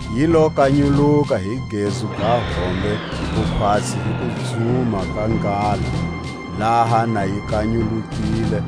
Yi lo kanyuluka hi gezu ga hombe, ku khwatsi hi kudzuma ka nghala; laha na yi kanyulukile,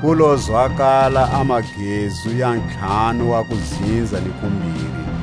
ku lo zwakala a magezu ya ntlhanu wa kudzinza ni kumbiri.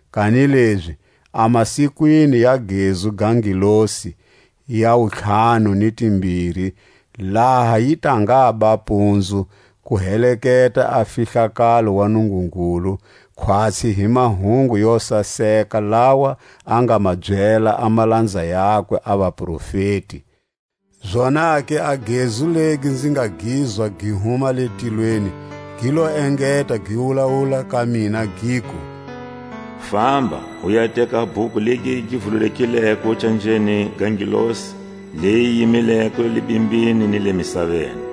Kanilezi a masikwini ya gezu ga ngelosi ya wuntlhanu ni timbiri, laha yi ta ngaba mpunzu, ku heteka a fihlakalo wa Nungungulu, khwatsi hi mahungu yo saseka lawa a nga ma byela a malanza yakwe a vaprofeti. Zonake a gezu legi nzi nga gizwa gi huma le tilweni, gi lo engeta gi wulawula ka mina, giku: Famba, u ya teka a bhuku legi gi vululekileko canjeni ga ngelosi leyi yi yimileko le bimbini ni le misaveni.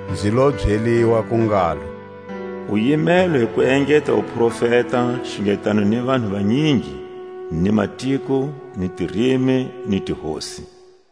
Nzi lo byeliwa ku ngalo: U yimelwe hi ku engeta u profeta xungetano ni vanhu vanyingi, ni matiko ni tirimi ni tihosi.